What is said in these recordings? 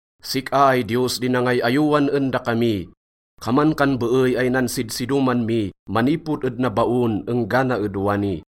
Sik-a ay Diyos di nangay-ayowan en dakami. Kaman kan beey ay nansidsidoman mi manipod ed nabaon enggana ed wani.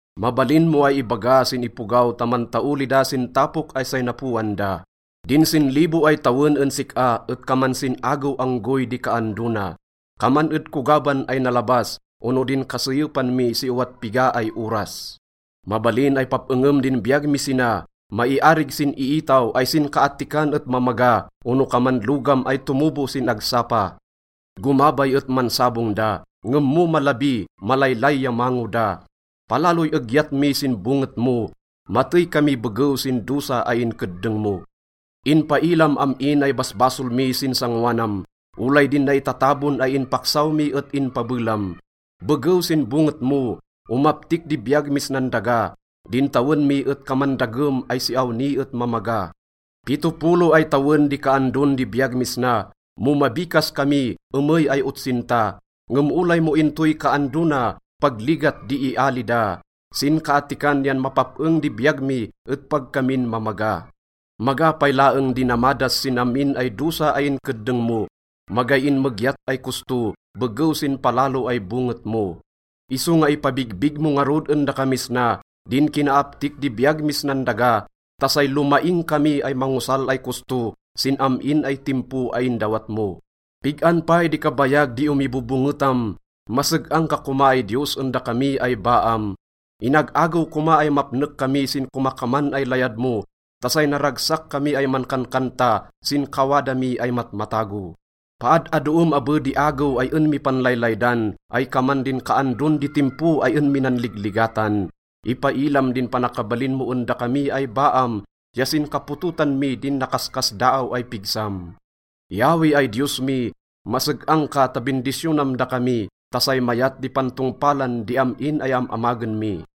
Mabalin mo ay ibaga sin ipogaw ta mantaoli da sin tapok ay say napoan da. Din sinlibo ay tawen en sik-a et kaman sin-agew anggoy di kaando na. Kaman ed kogaban ay nalabas ono din kaseyepan mi si owat piga ay oras. Mabalin ay pap-engem din biyag mi sina. Maiarig sin iitaw ay sinkaattikan et mamaga ono kaman logam ay tomobo sin agsapa. Gomabay et mansabong da, ngem mo malabi, malaylay ya mango da. Palaloy egyat mi sin bonget mo, matey kami begew sin dosa ay inkeddeng mo. Inpailam am-in ay basbasol mi sin sangoanam, olay din naitatabon ay inpaksaw mi et inpabelam. Begew sin bonget mo, omaptik di biyag mis nan daga, din tawen mi et kaman dagem ay si awni et mamaga. Pitopolo ay tawen di kaandon di biyag mis na. Mo mabikas kami, emey ay otsinta. Ngem olay mo intoy kaando na, pag ligat di iali da. Sinkaattikan yan mapap-eng di biyag mi et pag kamin mamaga. Maga pay laeng di namadas sin am-in ay dosa ay inkeddeng mo, magay inmegyat ay kosto begew sin palalo ay bonget mo. Isonga ipabigbig mo ngarud en dakamis na din kinaaptik di biyag mis nan daga ta say lomaing kami ay mangosal ay kosto sin am-in ay timpo ay indawat mo. Pig-an pay di kabayag di omibobongetam? Maseg-ang ka koma ay Diyos en dakami ay baam. Inag-agew koma ay mapnek kami sin komakaman ay layad mo ta say naragsak kami ay mankankanta sin kawada mi ay matmatago. Paad-adoem abe di agew ay en mi panlaylaydan ay kaman din kaandon di timpo ay en mi nanligligatan. Ipailam din panakabalin mo en dakami ay baam ya sin kapototan mi din nakaskasdaaw ay pigsam. Yahweh ay Diyos mi, maseg-ang ka ta bindisyonam dakami ta say mayat di pantongpalan di am-in ay am-amagen mi.